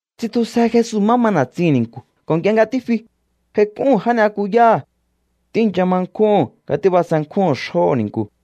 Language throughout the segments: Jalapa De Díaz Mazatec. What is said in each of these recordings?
Tsitjusje Jesu má ma na̱tsihi̱n ni̱nku̱ ko̱ nk'ie nga ja tífi, j'aik'úhu̱n já ni'yakuyáha̱. Tíi̱ncha ma nkjúhu̱n nga tíbasenkjúhu̱n xjóho̱ ni̱nku̱.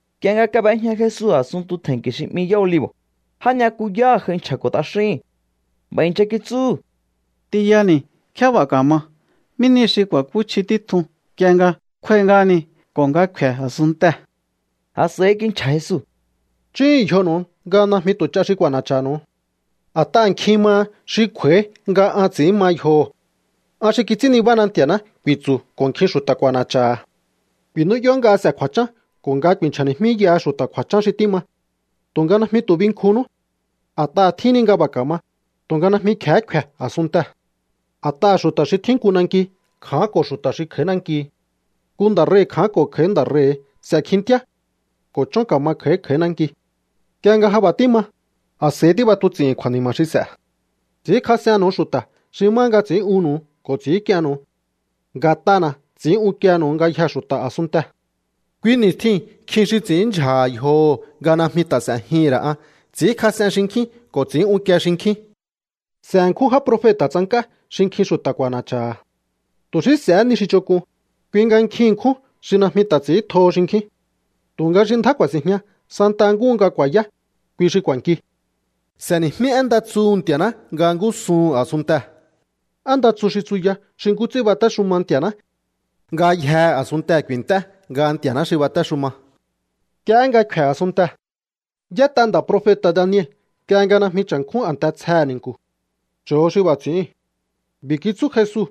Nk'ie nga kab'ejña Jesu a̱sunntu tje̱nki̱ xi 'mi Yá Olivo̱, já ni'yakuyáha̱ j'ai nchja̱ko̱ t'axíhi̱n. B'a̱ i̱ncha kitsúhu̱: —T'inyani̱, ¿nkjé b'a̱ ka̱ma? ¿Mí ni xi ku̱a̱kúchji títjun nk'ie nga kjúái̱ ngáhani ko̱ nga kfe̱ a̱sunntee̱? A̱s'a̱i kinchja̱ Jesu: —Chúhu̱un yjonu̱u nga najmi tu̱ ch'a xi k'u̱a̱na̱cha̱nu̱u. A̱t'aha̱ nkjin maha xi kj'u̱a̱í nga an ts'i̱ín ma yjoho̱. “An xi kits'ín nibána Nti̱a̱ná”, ku̱i̱tsu̱ ko̱ nkjin xu̱ta̱ k'u̱a̱na̱cha̱ha̱. ’Ku̱i̱nú'yó nga s'e̱ kju̱a̱chán ko̱ nga ku̱i̱nchja̱ni̱jmíyaha xu̱ta̱ kju̱a̱chán xi tíma, tu̱nga najmi tu̱ binkjunnú. A̱t'aha̱ tjíhin ni nga b'a̱ ka̱ma, tu̱nga najmi kje̱hé kfe̱ a̱sunntee̱. A̱t'aha̱ xu̱ta̱ xi tjín nku nanki kja̱ánko̱ xu̱ta̱ xi kj'a̱í nanki. Nku nda̱ rei̱ kja̱ánko̱ kj'a̱í nda̱ rei̱. S'e̱ kjintíá ko̱ chón ka̱ma kj'a̱í kj'a̱í nanki. Nk'ie nga ja b'a̱ tíma, a̱s'a̱ihí tíb'atuts'i̱hi̱n kju̱a̱ni̱ma̱ xi s'e̱. ’Ts'i̱ínkjas'ennu̱u xu̱ta̱ xi má nga ts'i̱ín'unnu̱u ko̱ ts'i̱ínk'iennu̱u. Nga̱t'ana̱ ts'i̱ín unkiehe̱nu̱u ngayjee̱ xu̱ta̱ a̱sunntee̱. Kui ni̱stjiu̱n nkjin xi ts'i̱ínndyja̱ha̱ yjoho̱ nga najmi ta̱ s'e̱jihi̱n ra̱ an. Ts'i̱ínkjas'en xinkjín ko̱ ts'i̱ín unkie xinkjín. S'e̱ ṉkjún já profeta̱ tsank'á xi nkjin xu̱ta̱ k'u̱a̱na̱cha̱ha̱. Tu̱ xí s'ehé ni xi ch'onk'un, kui nga nkjin ṉkjún xi najmi ta̱ ts'i̱íntjoho xinkjín. Tu̱nga xi ndjá ku̱a̱si̱njña santa nkúhu nga ku̱a̱yá, kui xi k'u̱a̱nki. S'e̱ni̱jmí én nda tsuhu̱ Nti̱a̱ná nga ngúsuhu̱n a̱sunntee̱, én nda tsu xi tsuya xi nkú ts'ín batéxuma Nti̱a̱ná. Ngayjehe̱ a̱sunntee̱ ku̱i̱nt'é nga Nti̱a̱ná xi batéxuma. Nk'iehé nga kfe̱ a̱sunntee̱. ’Y'ét'a nda̱ profeta̱ Daniel nk'ie nga najmi cha̱nkjún a̱nte tsjehe̱ ni̱nku̱. Cho̱o xi b'a̱ ts'i̱íu̱n. B'i̱ kitsú Jesu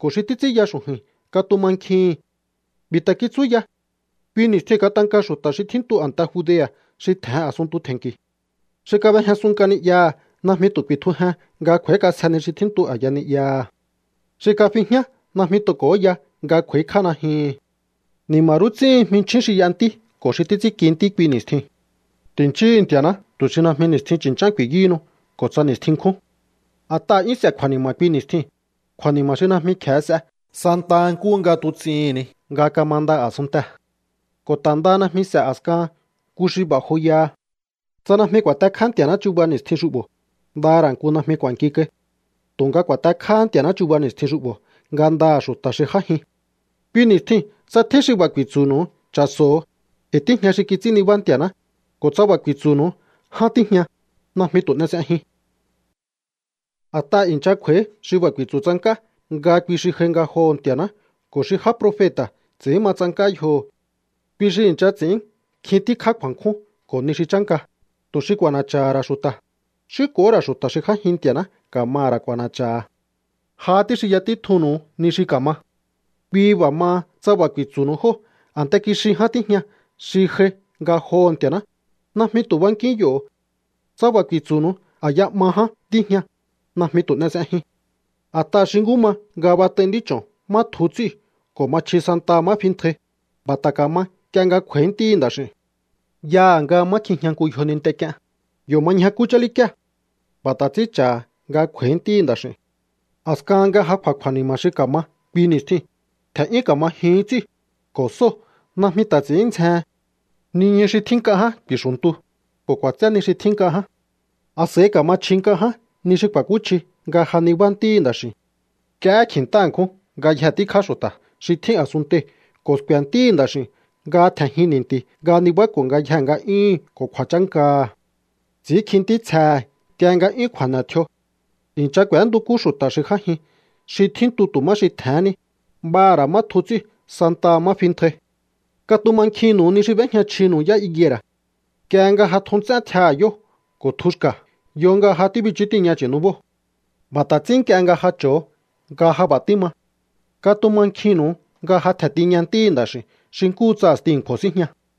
ko̱ xi títs'ínya xu̱ju̱i̱n katumankjihi̱n. B'i̱ ta̱ kitsú ya: —Kui ni̱stjiu̱n katanka xu̱ta̱ xi tjíntu a̱nte Judea̱ xi tje̱hen a̱sunntu tje̱nnki̱. Xi kab'ejñasun nk'a ni'yaha̱ najmi tu̱ ku̱i̱tjujen nga kj'u̱a̱ík'asje ni xi tjíntu a̱ya ni'yaha̱. Xi kafi jñá najmi tu̱ k'o̱óya nga kj'u̱a̱íkj'á najyuhu̱n. ’¡Ni̱ma̱ rú ts'íhin jminchjín xi y'a ntí ko̱ xi títs'ínki ntí kui ni̱stjiu̱n! Ti̱nchíhu̱u Nti̱a̱ná tu̱ xi najmi ni̱stjin chu̱nch'án ku̱i̱yúhunu ko̱ tsa ni̱stjin nkjún. A̱t'aha̱ 'yún s'e̱ kju̱a̱ni̱ma̱ kui ni̱stjiu̱n, kju̱a̱ni̱ma̱ xi najmi kje̱e s'e santa nkúhu nga tuts'ihi̱n ni nga kamanda a̱sunntee̱. Ko̱ ta̱ ndaha najmi s'e̱ a̱skahan nku xi b'a̱ joyaha. Tsa najmi ku̱a̱tekjá Nti̱a̱ná chuba ni̱stjin xu'bo̱, nda ra̱ nku najmi k'u̱a̱nki kai. Tu̱nga ku̱a̱tekjáhá Nti̱a̱ná chuba ni̱stjin xu'bo̱ ngandaha̱ xu̱ta̱ xi j'ájin. ’Kui ni̱stjiu̱n tsa tjín xi b'a̱ ku̱i̱tsu̱nu̱u: “Cha̱so̱o, e̱i̱ tíjña xi kits'ín nibá Nti̱a̱ná”, ko̱ tsa b'a̱ ku̱i̱tsu̱nu̱u: “Ján tíjña”, najmi tu̱ n'e s'ejiun. A̱t'aha̱ i̱ncha kj'u̱a̱í xi b'a̱ ku̱i̱tsu̱ tsank'á nga kui xi j'ai ngajoho̱ Nti̱a̱ná ko̱ xi já profeta̱ ts'i̱ín ma tsank'á yjoho̱. Kui xi i̱ncha ts'i̱ín nkjin tíkjá kju̱a̱nkjún ko̱ ni xi chánka, tu̱ xi k'u̱a̱na̱cha̱ha̱ ra̱ xu̱ta̱, xí ko̱hó ra̱ xu̱ta̱ xi j'ájin Nti̱a̱ná ka̱maha̱ ra̱ k'u̱a̱na̱cha̱ha̱. Jahá tíxinya títjunnu̱u ni xi ka̱ma. ’Kui b'a̱ maha, tsa b'a̱ ku̱i̱tsu̱nu̱u jóo̱: “A̱nte kixi ján tíjña xi j'ai ngajoho̱ Nti̱a̱ná”, najmi tu̱ bankíún yo̱. Tsa b'a̱ ku̱i̱tsu̱nu̱u: “A̱ya 'ma ján tíjña”, najmi tu̱ n'e s'ejiun. A̱t'aha̱ xi nkú ma nga bat'ai nd'ích'o̱n má tju ts'íu̱ ko̱ ma chji santaha má fintjai, b'a̱ ta̱ ka̱ma nk'ie nga kj'u̱a̱í Ntíhi̱ Nda̱x'i̱u̱n. Yaha̱ nga má kjijña nku yjoninte k'ien, yo̱ ma ñjakú chálíkíe̱. B'a̱ ta̱ ts'ín cha̱ha̱ nga kj'u̱a̱í Ntíhi̱ Nda̱x'i̱u̱n. ’A̱skahan nga ja kj'u̱a̱ kju̱a̱ni̱ma̱ xi ka̱ma kui ni̱stjiu̱n, tje̱n'yún ka̱ma jyuhún ts'íu̱, ko̱ sóo̱ najmi ta̱ ts'i̱ín ndzjehen. Niñu xi tjín nk'a ján ku̱i̱xu̱ntu, ko̱ k'u̱a̱tsé ni xi tjín nk'a ján. A̱s'a̱i ka̱ma chji nk'a ján ni xi ku̱a̱kúchji nga ja nibá Ntíhi̱ Nda̱x'i̱u̱n. Nk'iehé kji̱nta nkjún ngayje tíkjá xu̱ta̱ xi tjín a̱sunntei̱ ko̱ sku̱e̱ Ntíhi̱ Nda̱x'i̱u̱n nga tje̱njin ni̱nti̱ nga nibáko̱ ngayjee̱ nga'yúhu̱n ko̱ kju̱a̱chánkaha̱. Ts'i̱ínkji ntítsjehe̱ nk'ie nga 'yún kju̱a̱ne̱ tjio̱. I̱ncha k'u̱éntukú xu̱ta̱ xi j'ájin xi tjíntu tu̱ má xi tje̱hén ni, b'aha̱ ra̱ má tju ts'íu̱ santaha má fintjai. ’Katumankjinnu̱u ni xi b'éjña chjinu̱u yá higuera̱. Nk'ie nga ja tju nts'én tjiaha̱ yóo̱ ko̱ tjuhu̱ xka̱, yo nga ja tíbichú tiña chu̱nubóo̱. B'a̱ ta̱ ts'ín nk'ie nga ja cho̱o nga ja b'a̱ tíma, katumankjinnu̱u nga ja tje̱n tiña Ntíhi̱ Nda̱x'i̱u̱n xi nkúhu tsa a̱sti a̱nkju̱o̱ síjña.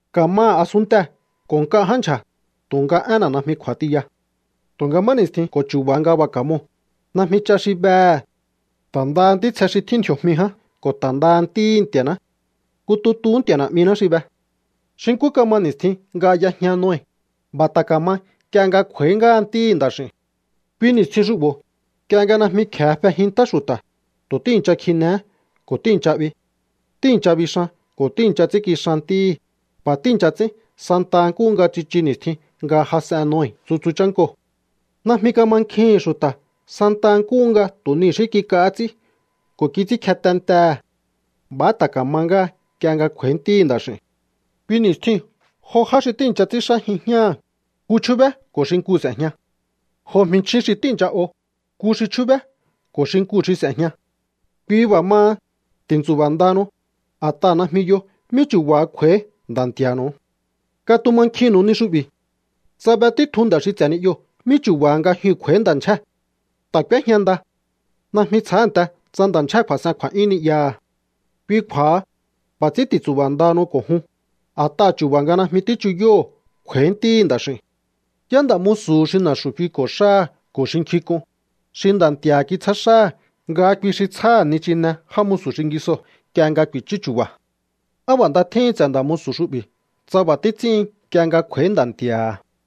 Ka̱maha̱ a̱sunntee̱ ko̱ nk'a ján ndyja̱, tu̱nga énna̱ najmi kj'u̱a̱ tiya. ’Tu̱nga má ni̱stjin ko̱ chu̱ba̱ nga b'a̱ ka̱moo̱, najmi ch'a xi behe̱, ta̱ ndaha ntítsje xi tjín ndji̱o̱jmi ján ko̱ ta̱ ndaha Ntíhi̱ Nti̱a̱ná. Nku tutuhú Nti̱a̱ Na̱'miná xi be. Xi nkú kama ni̱stjin nga y'ejña Noe, b'a̱ ta̱ ka̱ma nk'ie nga kj'u̱a̱í ngáha Ntíhi̱ Nda̱x'i̱u̱n. Kui ni̱stjin xu'bo̱, nk'ie nga najmi kje̱e fejin ntá xu̱ta̱, tu̱ tíi̱ncha kjinehé ko̱ tíi̱ncha 'bi. Tíi̱ncha bixan ko̱ tíi̱ncha ts'ínkixan ntíhí. B'a̱ tíi̱ncha ts'ín santa nkúhu nga tsichu ni̱stjin nga jas'en Noe tsutsu chánkoo̱. Najmi kamankjihi̱n xu̱ta̱ santaha nkúhu nga tu̱ ni xí kik'ahá ts'í ko̱ kits'ínkje tentehe̱. B'a̱há ta̱ ka̱ma ngáha nk'ie nga kj'u̱a̱í Ntíhi̱ Nda̱x'i̱u̱n. Kui ni̱stjiu̱n jo já xi tíi̱ncha ts'ínxájin jñáha̱, nku chjúbé ko̱ xinkuu̱ s'e̱jña. Jo jminchjín xi tíi̱ncha o, nku xi chjúbé ko̱ xinkuu̱ xi s'e̱jña. ’Kui b'a̱ maha, ti̱ntsu̱ba̱ ndahanu, a̱t'aha̱ najmi yo mí chu̱ba̱ha kj'u̱a̱í Nda̱ Nti̱a̱nu̱u. Katumankjinnu̱u ni xu'bi̱. Tsa be títjun nda̱ xi ts'e̱ ni'yoo̱ mí chu̱ba̱ha nga jyuu̱n kj'u̱a̱í nda̱ ndyjée̱, ta̱ k'úéjña nda. Najmi tsjánte tsa nda̱ ndyjée̱ kju̱a̱s'en kju̱a̱'yún ni'yaha̱. Kui kju̱a̱ha, b'a̱ ts'ín ti̱ntsu̱ba̱ ndahanu ko̱ jun, a̱t'aha̱ chu̱ba̱ nga najmi tíchuyóho̱o kj'u̱a̱í Ntíhi̱ Nda̱x'i̱u̱n. ’¿Yá nda̱ musu̱hu xi na̱xu̱ fiko̱ xáha̱ ko̱ xi nkjink'un, xi nda̱ nti̱a̱ha̱ kitsjá xáha̱ nga kui xi tsjáha̱ nichine já musu̱ xingisoo̱ nk'ie nga ku̱i̱chú chu̱ba̱? ¡Á b'a̱ nda tjíhin ts'e̱ nda̱ musu̱ xu'bi̱ tsa b'a̱ títs'ín nk'ie nga kj'u̱a̱í nda̱ nti̱a̱ha̱!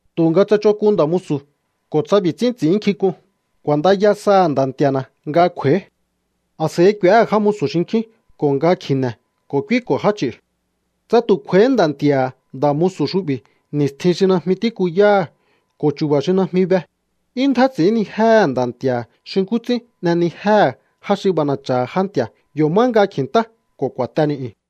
’Tu̱nga tsa ch'onk'un nda̱ musu̱ ko̱ tsa b'i̱ ts'ín ts'i̱ínnkjink'un: “K'u̱a̱ndaya saha̱ nda̱ nti̱a̱na̱ nga kj'u̱a̱í.” A̱s'a̱i k'u̱éhe̱ já musu̱ xinkjín ko̱ nga kji̱ne̱ ko̱ k'úíko̱ já ch'i̱u̱. Tsa tu̱ kj'u̱a̱íhí nda̱ nti̱a̱ha̱ nda̱ musu̱ xu'bi̱ ni̱stjin xi najmi tíkuyáha̱ ko̱ chu̱ba̱ xi najmi be, 'yún ndjá ts'i̱ínnijéhe̱ nda̱ nti̱a̱ha̱ xi nkú ts'ín n'enijéhe̱ já xi b'ana̱cha̱ha̱ já nti̱a̱, yo̱ má nga kji̱ntá ko̱ ku̱a̱te ni̱'yu̱n.